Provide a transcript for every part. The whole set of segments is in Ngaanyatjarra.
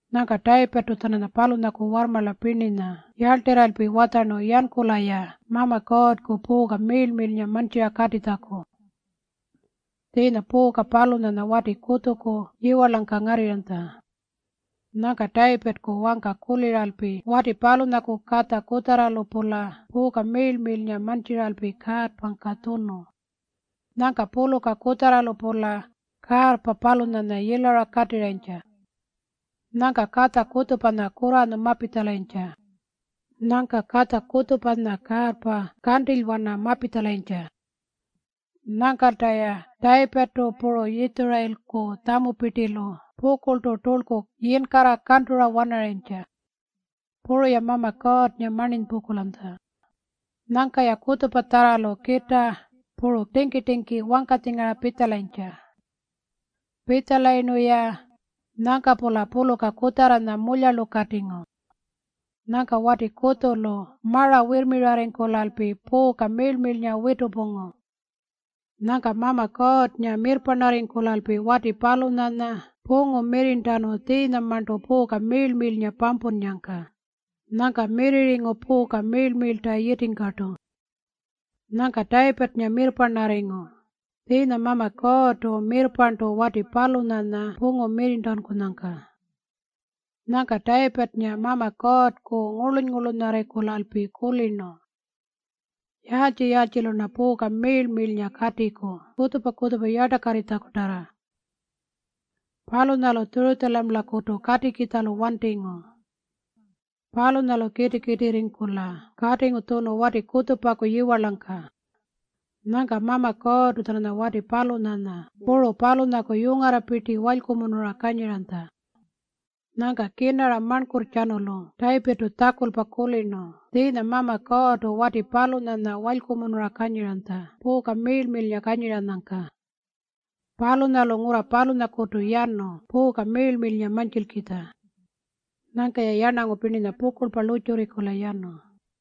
Nyangka Tayipirrtu-tjananya palunyaku warrmarla pirninya yarltirralpi watjarnu yankula-ya Mama Kuurrku puuka miirl-miirlnga mantjira katitjaku. Tjiinya puuka palunyanya wati kutjuku yiwarlangka ngaralanytja. Nyangka Tayipirrku wangka kuliralpi wati palunyaku katja kutjarralu-pula puuka miirl-miirlnga mantjiralpi kaarrpangka tjunu. Nyangka puluka kutjarralu-pula kaarrpa palunyanya yilara katirrayintja. Nyangka katja kutjupanya kurranyu mapitjalayintja. Nyangka katja kutjupanya kaarrpa kantilywana mapitjalayintja. Nyangkalta-ya Tayipirrtu puru Yitjurayilku tjamupirtilu pukurltu turlku yinkarra kantura wanarayintja. Puru-ya Mama Kuurrnga marninypungkulanytja. Nyangka-ya kutjupatjarralu kitaa puru tingki-tingki wangkatjingara pitjalayintja. Pitjalayirnu-ya, nyangka-pula puluka kutjarranya mulyarlukatingu. Nyangka wati kutjulu mara wirrmirarringkulalpi puuka miirl-miirlnga witurrpungu. Nyangka Mama Kuurrnga mirrparnarringkulalpi wati palunyanya pungu mirrirntanu tjiinyamarntu puuka miirl-miirlnga pampunnyangka. Nyangka mirrirringu puuka miirl-miirlta yitingkartu. Nyangka Tayipirrnga mirrparnarringu tjiinyamarntu Mama Kuurrtu mirrparntu wati palunyanya pungu mirrirntankunyangka. Nyangka Tayipirrnga Mama Kuurrku ngurluny-ngurlunyarringkulalpi kulirnu, “Yaaltji-yaaltjilu-rna puuka miirl-miirlnga katiku kutjupa-kutjupa yartakarritjakutarra?” Palunyalu Tjurutjamalakutu katikitjalu wantingu. Palunyalu kiti-kitirringkula katingu tjunu wati kutjupaku yiwarlangka. Nyangka Mama Kuurrtu-tjananya wati palunyanya puru palunyaku yungarrapirti walykumunura kanyiranytja. Nyangka kirnara marnkurrtjanulu Tayipirrtu tjakulpa kulirnu tjiinya Mama Kuurrtu wati palunyanya walykumunura kanyiranytja puuka miirl-miirlnga kanyiranyangka. Palunyalu ngurra palunyakutu yanu puuka miirl-miirlnga mantjilkitja. Nyangka-ya yarnangu pirninya pukurlpa lurrtjurringkula yanu.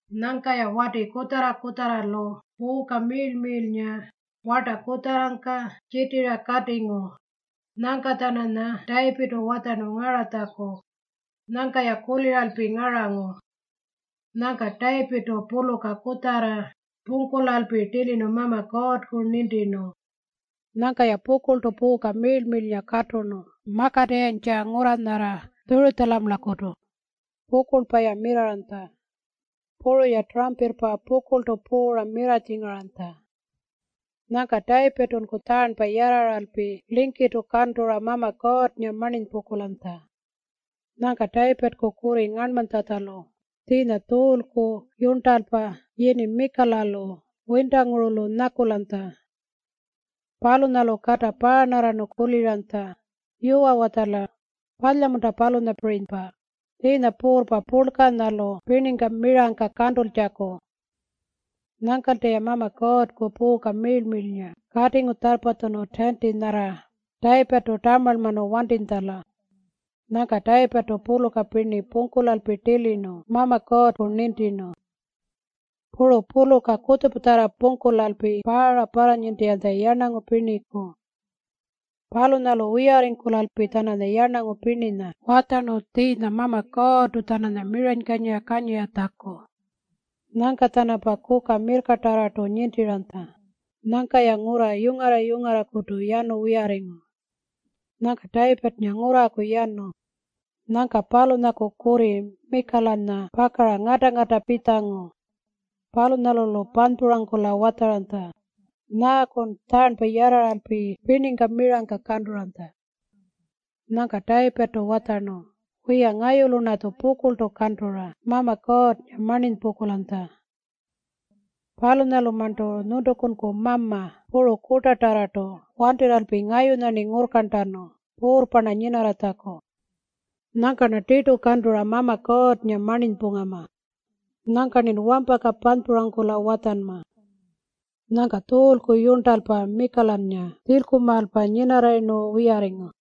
Nyangka-ya wati kutjarra-kutjarralu puuka miirl-miirlnga warta kutjarrangka tjitira katingu. Nyangka-tjananya Tayipirrtu watjarnu ngaratjaku. Nyangka-ya kuliralpi ngarangu. Nyangka Tayipirrtu puluka kutjarra pungkulalpi tilirnu Mama Kuurrku nintirnu. Nyangka-ya pukurltu puuka miirl-miirlnga katurnu makatirrayintja ngurra nyarra Tjurutjamalakutu. Pukurlpa-ya mirrarranytja. Puru-ya turampirrpa pukurltu puura mirratjingaranytja. Nyangka Tayipirrtunku tjaarnpa yarraralpi lingkirrtu kantura Mama Kuurrnga marninypungkulanytja. Nyangka Tayipirrku kurri ngarnmanytjatjalu, tjiinya Tjuulku yurntalpa yini Mikalalu wintangurulu nyakulanytja. Palunyalu kata paarnarrarnu kuliranytja, “Yuwa-watjala, palya-munta palunyapirinypa, tjiinya puurrpa purlkanyalu pirningka mirangka kantultjaku?” Nyangkalta-ya Mama Kuurrku puuka miirl-miirlnga katingu tjarrpatjunu tiinti nyarra Tayipirrtu tamarlmanu wantitjala. Nyangka Tayipirrtu puluka pirni pungkulalpi tilirnu Mama Kuurrku nintirnu. Puru puluka kutjupatjarra pungkulalpi paara parranintiranytja yarnangu pirniku. Palunyalu wiyarringkulalpi-tjananya yarnangu pirninya watjarnu tjiinya Mama Kuurrtu-tjananya miranykanyira kanyiratjaku. Nyangka-tjanampa kuka mirrkatarrartu nintiranytja. Nyangka-ya ngurra yungarra-yungarrakutu yanu wiyarringu. Nyangka Tayipirrnga ngurraku yanu. Nyangka palunyaku kurri Mikalanya pakara ngata-ngata pitjangu. Palunyalu-lu panypurangkula watjaranytja, “Nyaakun tjaarnpa yarraralpi pirningka mirangka kanturanytja?” Nyangka Tayipirrtu watjarnu, “Wiya, ngayulu-rnatju pukurltu kantura Mama Kuurrnga marninypungkulanytja. Palunyalumarntu nyuntukunku mama puru kurtatarrartu wantirralpi ngayunya-rni ngurrkarntanu puurrpa-rna nyinarratjaku. Nyangka-rna tirtu kantura Mama Kuurrnga marninypungama. Nyangka-rnin wampaka panypurangkula watjanma.” Nyangka Tjuulku yurntalpa Mikalanya tjilkumaalpa nyinarrayirnu wiyarringu.